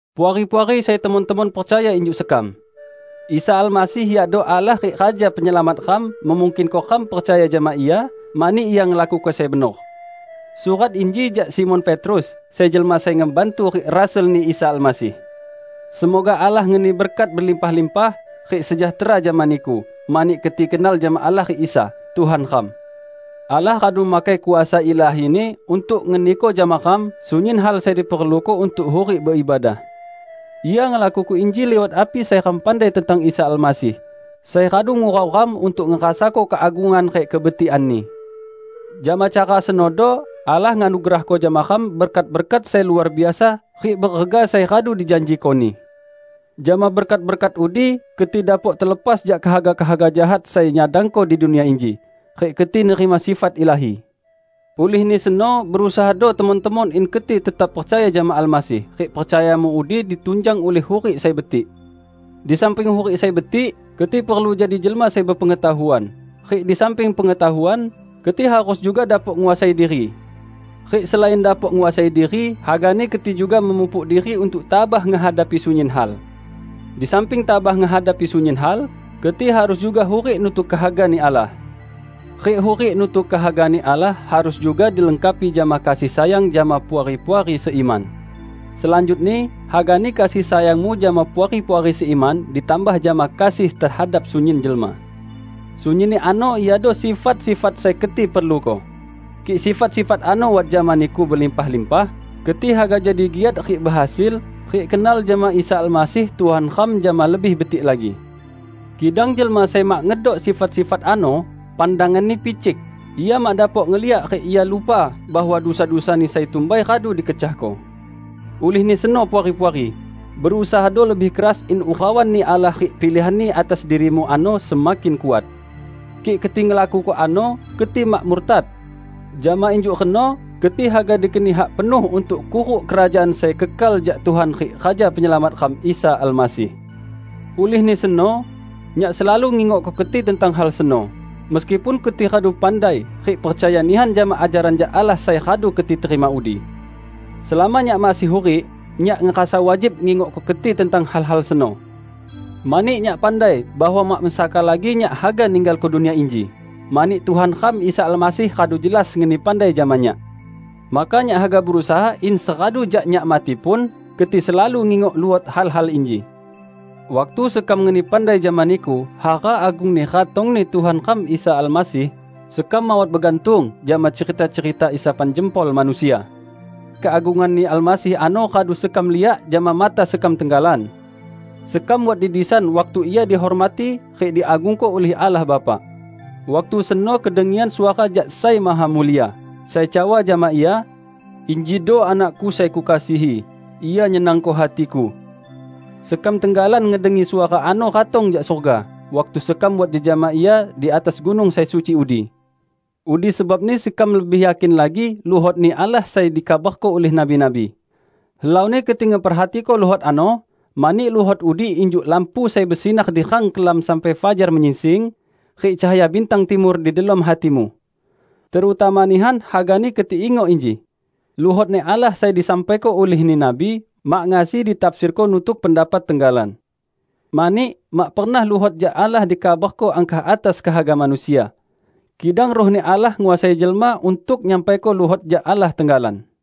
Puari-puari sai temon-temon percaya injuk sekam! Isa Almasih, yakdo Allah rik Raja Penyelamat ram, memungkinko ram percaya jama Ia, mani Ia ngelakuko sai benor. Surat inji jak Simon Petrus, sai jelma sai ngebantu rik rasul-Ni Isa Almasih. Semoga Allah ngeni berkat belimpah-limpah rik sejahtera jama niku, mani keti kenal jama Allah rik Isa, Tuhan ram. Allah radu makai kuasa ilahi-Ni untuk ngeniko jama ram sunyin hal sai diperluko untuk hurik beibadah. Ia ngelakuko inji liwat api sai ram pandai tentang Isa Almasih, sai radu ngurau ram untuk ngerasako keagungan rik kebetikan-Ni. Jama cara senodo Allah nganugerahko jama ram berkat-berkat sai luar biasa rik berega sai radu dijanjiko-Ni. Jama berkat-berkat udi keti dapok telepas jak kehaga-kehaga jahat sai nyadangko di dunia inji, rik keti nerima sifat ilahi. Ulihni seno, berusahado temon-temon in keti tetap percaya jama Almasih rik percayamu udi ditunjang ulih hurik sai betik. Di samping hurik sai betik, keti perlu jadi jelma sai bepengetahuan, rik di samping pengetahuan, keti harus juga dapok nguasai diri. Rik selain dapok nguasai diri hagani keti juga memupuk diri untuk tabah ngehadapi sunyin hal. Di samping tabah ngehadapi sunyin hal, keti harus juga hurik nutuk kehaga-Ni Allah. Rik hurik nutuk kehaga-Ni Allah harus juga dilengkapi jama kasih sayang jama puari-puari seiman. Selanjutni hagani kasih sayangmu jama puari-puari seiman ditambah jama kasih tehadap sunyin jelma. Sunyinni ano iado sifat-sifat sai keti perluko. Kik sifat-sifat ano wat jama niku belimpah-limpah, keti haga jadi giat rik behasil, rik kenal jama Isa Almasih Tuhan ram jama lebih betik lagi. Kidang jelma sai mak ngedok sifat-sifat ano, pandanganni picik; ia mak dapok ngeliak rik ia lupa bahwa dusa-dusani sai tumbai radu dikecahko. Ulihni seno Puari-puari, berusahado lebih keras in urauan-Ni Allah rik pilihan-Ni atas dirimu ano semakin kuat. Kik keti ngelakuko ano, keti mak murtad. Jama injuk reno keti haga dikeni hak penuh untuk kuruk Kerajaan sai kekal jak Tuhan rik Raja Penyelamat ram Isa Almasih. Ulihni seno, nyak selalu ngingokko keti tentang hal seno, meskipun keti radu pandai rik percaya nihan jama ajaran jak Allah sai radu keti terima udi. Selama nyak masih hurik, nyak ngerasa wajib ngingokko keti tentang hal-hal seno. Mani nyak pandai bahwa mak mesaka lagi nyak haga ninggalko dunia inji, mani Tuhan ram Isa Almasih radu jelas ngeni pandai jama nyak. Maka nyak haga berusaha in seradu jak nyak mati pun, keti selalu ngingok luot hal-hal inji. Waktu sekam ngeni pandai jama niku hara agungni ratong-Ni Tuhan ram Isa Almasih, sekam mawat begantung jama cerita-cerita isapan jempol manusia. Keagungan-Ni Almasih ano radu sekam liak jama mata sekam tenggalan. Sekam wat di disan waktu Ia dihormati rik diagungko ulih Allah Bapa. Waktu seno kedengian suara jak Sai Mahamulia, sai cawa jama Ia, "Injido Anak-Ku sai Kukasihi. Ia nyenangko hati-Ku!" Sekam tenggalan ngedengi suara ano ratong jak surga waktu sekam wat jejama Ia di atas gunung sai suci udi. Udi sebabni sekam lebih yakin lagi luhot-Ni Allah sai dikabarko ulih nabi-nabi. Helauni keti ngeperhatiko luhot ano, mani luhot udi injuk lampu sai besinar di rang kelam sampai fajar menyingsing, rik cahaya bintang timur di delom hatimu. Terutama nihan hagani keti ingok inji: Luhot-Ni Allah sai disampaiko ulihni nabi mak ngasi ditafsirko nutuk pendapat tenggalan. Mani, mak pernah luhot jak Allah dikabarko angkah atas kehaga manusia. Kidang Ruh-Ni Allah nguasai jelma untuk nyampaiko luhot jak Allah tenggalan.